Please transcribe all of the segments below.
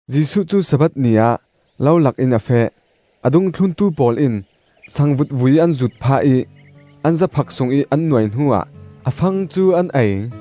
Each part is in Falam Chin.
Jesuh cu Sabbath ni ah lo lakin a feh. A dungthlun pawl in sangvut vui an zuut phah ih an zaphak sungih an nuai hnuah a fang cu an ei.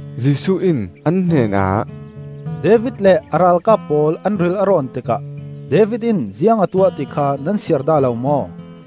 Jesuh in an hnenah, “David le a ralkap pawl an ril a rawn tikah David in ziang a tuah ti kha nan siar dah lo maw?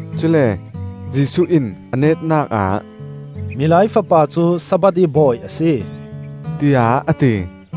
Cule Jesuh in a netnak ah, “Milai Fapa cu Sabbath ih Bawi a si,” tiah a ti.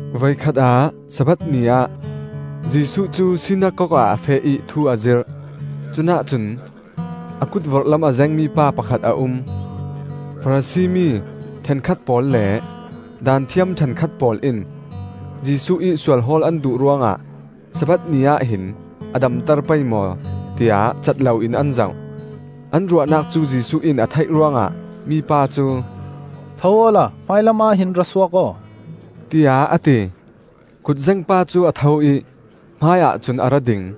Voikhat ah Sabbath ni ah Jesuh cu sinakok ah a feh ih thu a zirh. Cunah cun a kut vorhlam a zengmi pa pakhat a um. Farasi mi ṭhenkhat pawl le Daanthiam ṭhenkhat pawl in Jesuh ih sual hawl an duh ruangah Sabbath ni ahhin a damter pei maw, tiah cat loin an zoh. An ruahnak cu Jesuh in a theih ruangah mipa cu, “Tho awla hmailam ahhin ra suak aw,” tiah a ti. Kutzeng pa cu a tho ih hmaiah cun a ra ding.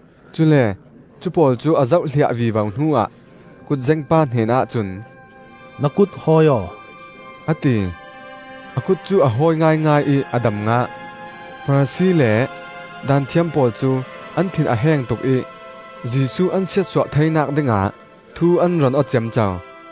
Cule cu pawl cu a zohhliah vivo hnuah kutzeng pa hnenah cun, “Na kut hawi aw,” a ti. A kut cu a hawi ngaingai ih a dam ngah. Farasi le Daanthiam pawl cu an thin a heng tuk ih Jesuh an siatsuah theinak dingah thu an ron aw ciamco.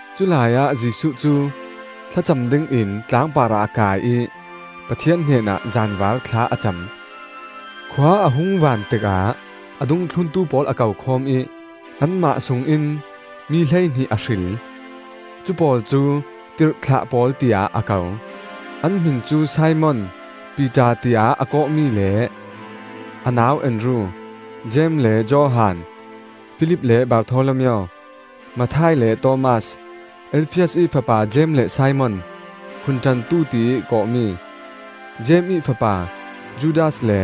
Culai ah Jesuh cu thlacam dingin tlang parah a kai ih Pathian hnenah zanvar thla a cam. Khua a hung vaan tikah a dungthlun pawl a ko khawm ih anmah sungin mi hleihnih a hril; cupawl cu ‘Tirhthlah pawl’ tiah a ko. An hmin cu Simon (Piter tiah a kawhmi) le a nau Andru, Jeim le Johan, Filip le Bartholomeo, Matthai le Thomas, Alfias ih fapa Jeim le Simon (Phunṭantu tiih kawhmi), Jeim ih fapa Judas le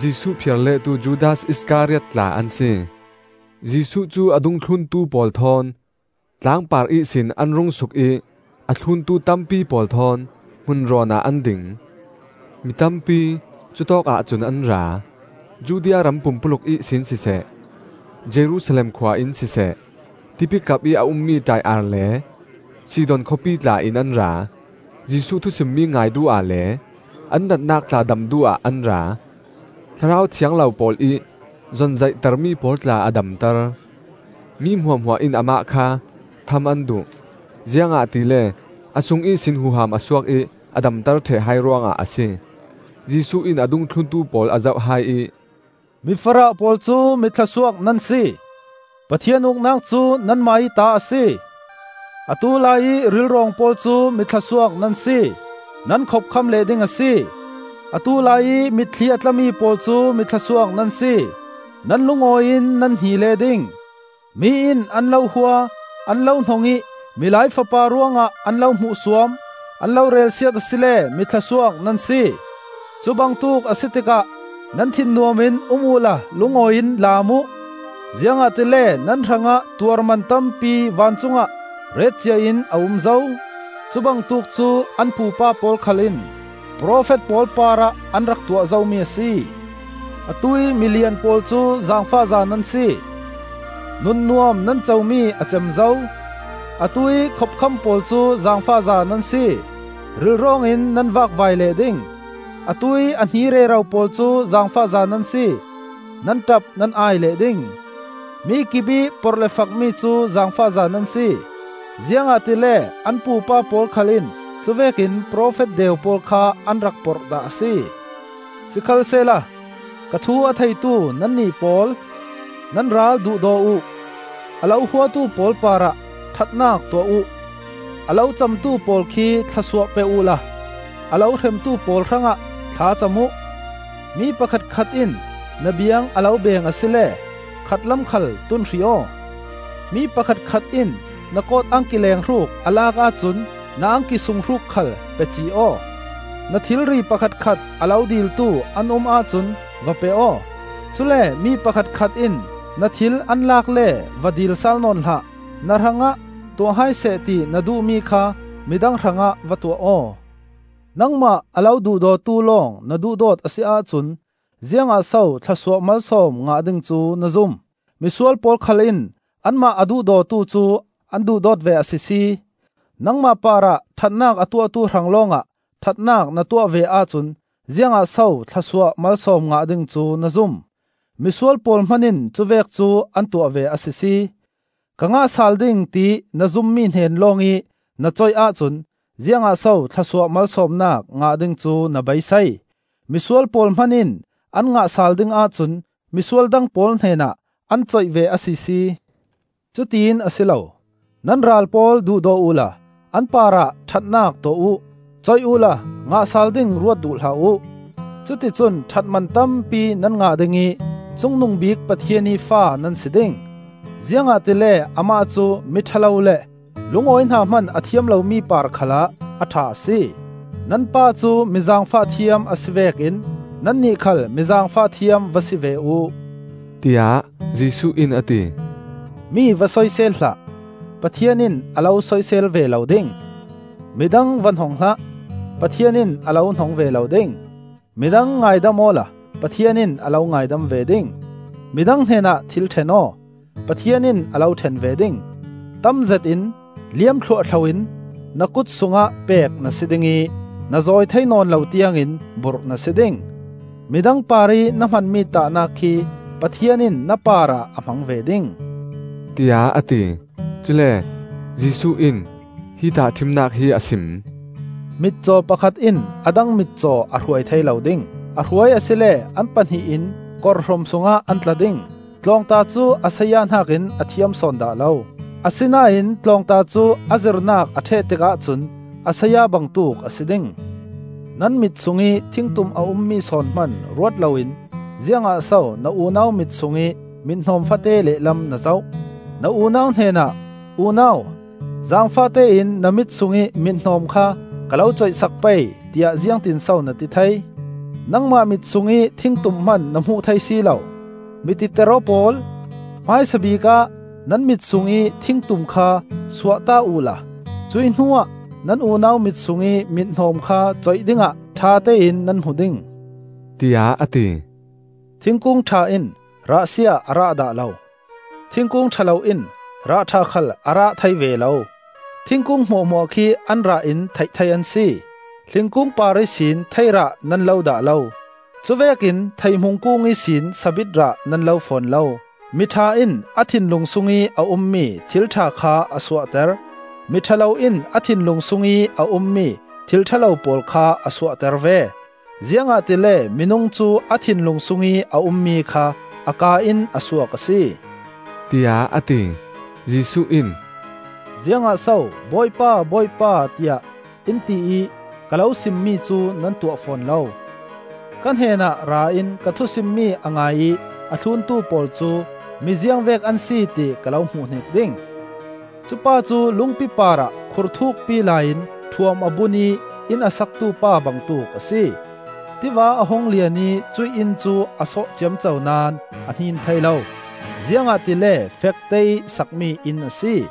Jesuh phiar lehtu Judas Iskariot tla an si. Jesuh cu a dungthlun pawl thawn tlangpar ihsin an rung suk ih a thluntu tampi pawl thawn hmun rawn ah an ding. Mitampi cutawkah cun an ra; Judea ram pumpuluk ihsin siseh, Jerusalem khua in siseh, tipikap ih a ummi Taiar le Sidon khawpi tla in an ra. Jesuh thusimmi ngai duh ah le an natnak tla dam duh ah an ra. Thlarau thiang lo pawl ih zonzaihtermi pawl tla a damter. Mi hmuahhmuah in amah kha tham an duh; ziangahtile a sung ihsin huham a suak ih a damter ṭheh hai ruangah a si. Jesuh in a dungthluntu pawl a zoh hai ih, “Mi farah pawl cu mi thlawsuak nan si, Pathian Uknak cu nanmah ih ta a si! “Atu laiih rilrawng pawl cu mi thlawsuak nan si, nan khopkham leh ding a si! “Atu laiih mitthli a tlami pawl cu mi thlawsuak nan si, nan lungawiin nan hni leh ding. “Mi in an lo hua, an lo hnong ih Milai Fapa ruangah an lo hmuhsuam, an lo relsiat asile mi thlawsuak nan si! Cubangtuk a si tikah nan thin nuam in um uhla lungawiin laam uh; ziangahtile nan hrangah tuarman tampi vancungah retcia in a um zo. Cubangtuk cu an pupa pawl khal in profet pawl parah an rak tuah zomi a si. “Atuih milian pawl cu zaangfakza nan si; nunnuam nan comi a cem zo! “Atuih a khopkham pawl cu zaangfakza nan si; rilrawngin nan vakvai leh ding. “Atuih a hni rero pawl cu zaangfakza nan si; nan ṭap nan ai leh ding. “Mikip ih porh le fakmi cu zaangfakza nan si; Ziangahtile an pupa pawl khal in cuvekin profet deu pawl kha an rak porh dah a si. “Sikhalsehla ka thu a theitu nannih pawl: Nan ral duhdaw uh; a lo huatu pawl parah ṭhatnak tuah uh; a lo camtu pawl khi thlawsuah pe uhla a lo hremtu pawl hrangah thla cam uh. Mi pakhatkhat in na biang a lo beng asile khatlam khal tun hrih aw; mi pakhatkhat in na kawt angki lenghruk a lak ahcun na angki sunghruk khal pe cih aw. Na thilri pakhatkhat a lo diltu an um ahcun va pe aw; cule mi pakhatkhat in na thil an lak le va dil sal nawn hlah. Na hrangah tuah hai sehla ti na duhmi kha midang hrangah va tuah aw. “Nangmah a lo duhdawtu lawng na duhdawt a si ahcun ziangah so thlawsuah malsawm ngah ding cu na zum? Misual pawl khal in anmah a duhdawtu cu an duhdawt ve a sisi! Nangmah parah ṭhatnak a tuahtu hrang lawngah ṭhatnak na tuah ve ahcun ziangah so thlawsuah malsawm ngah ding cu na zum? Misual pawl hman in cuvek cu an tuah ve a sisi! Ka ngah sal ding tiih na zummi hnen lawngih na coih ahcun ziangah so thlawsuah malsawmnak ngah ding cu na beisei? Misual pawl hman in an ngah sal ding ahcun misual dang pawl hnenah an coih ve a sisi! Cutiin a si lo! Nan ral pawl duhdaw uhla an parah ṭhatnak tuah uh. Coih uhla ngah sal ding ruat duh hlah uh. Cuticun ṭhatman tampi nan ngah ding ih Cungnungbik Pathian ih fa nan si ding. Ziangahtile amah cu miṭha lo le lungawi hna hman a thiam lomi par khalah a ṭha a si. Nan Pa cu mi zaangfah thiam a si vekin nannih khal mi zaangfah thiam va si ve uh,” tiah Jesuh in a ti. Mi va soisel hlah, Pathian in a lo soisel ve lo ding. Midang va hnong hlah, Pathian in a lo hnong ve lo ding. Midang ngaidam awla Pathian in a lo ngaidam ve ding. Midang hnenah thil ṭhen aw, Pathian in a lo ṭhen ve ding. Tamzet in, liam thluahthlo in, na kut sungah pek na si ding ih na zawi thei nawn lo tiangin burh na si ding. Midang parih na hmanmi tahnak khi Pathian in na parah a hmang ve ding,” tiah a ti. Cule Jesuh in hi tahṭhimnak hi a sim: “Mitcaw pakhat in a dang mitcaw a hruai thei lo ding. A hruai asile an pahnih in korhrum sungah an tla ding. Tlawngta cu a saya hnakin a thiam sawn dah lo; asinain tlawngta cu a zirnak a ṭheh tikah cun a saya bangtuk a si ding. “Nan mit sungih thingtum a ummi sawn hman ruat loin ziangah so na unau mit sungih mit-hnawm fate lehlam na zoh? Na unau hnenah ‘Unau, zaangfahte in na mit sungih mithnawm kha ka lo coih sak pei,’ tiah ziangtinso na ti thei? Nangmah mit sungih thingtum hman na hmuh thei si lo! Mi titer aw pawl! Hmaisabik ah nan mit sungih thingtum kha suahta uhla cuih hnuah nan unau mit sungih mithnawm kha coih dingah ṭhatein nan hmu ding,” tiah a ti. Thingkung ṭha in rahsia a rah dah lo; thingkung ṭha lo in rah ṭha khal a rah thei ve lo. Thingkung hmuahhmuah khi an rah in theih thei an si: hlingkung par ihsin thei rah nan lo dah lo; cuvekin theihmu kung ihsin sabit rah nan lo fawn lo. Mi ṭha in a thinlung sungih a ummi thil ṭha kha a suahter; mi ṭha lo in a thinlung sungih a ummi thil ṭha lo pawl kha a suahter ve. Ziangahtile minung cu a thinlung sungih a ummi kha a kaa in a suak a si,” tiah a ti. Jesuh in, “Ziangah so ‘Bawipa, Bawipa,’ tiah in ti ih ka lo sim mi cu nan tuah fawn lo? Ka hnenah ra in ka thusimmi a ngai ih a thluntu pawl cu mi ziangvek an si, ti ka lo hmuhhnik ding. Cupa cu lungpi parah khur thukpi lai in ṭhuam a bun ih inn a saktu pa bangtuk a si. Tiva a hung lian ih cuih inn cu a sawh ciamco naón a hnin thei lo; ziangahtile fekteih sakmi inn a si.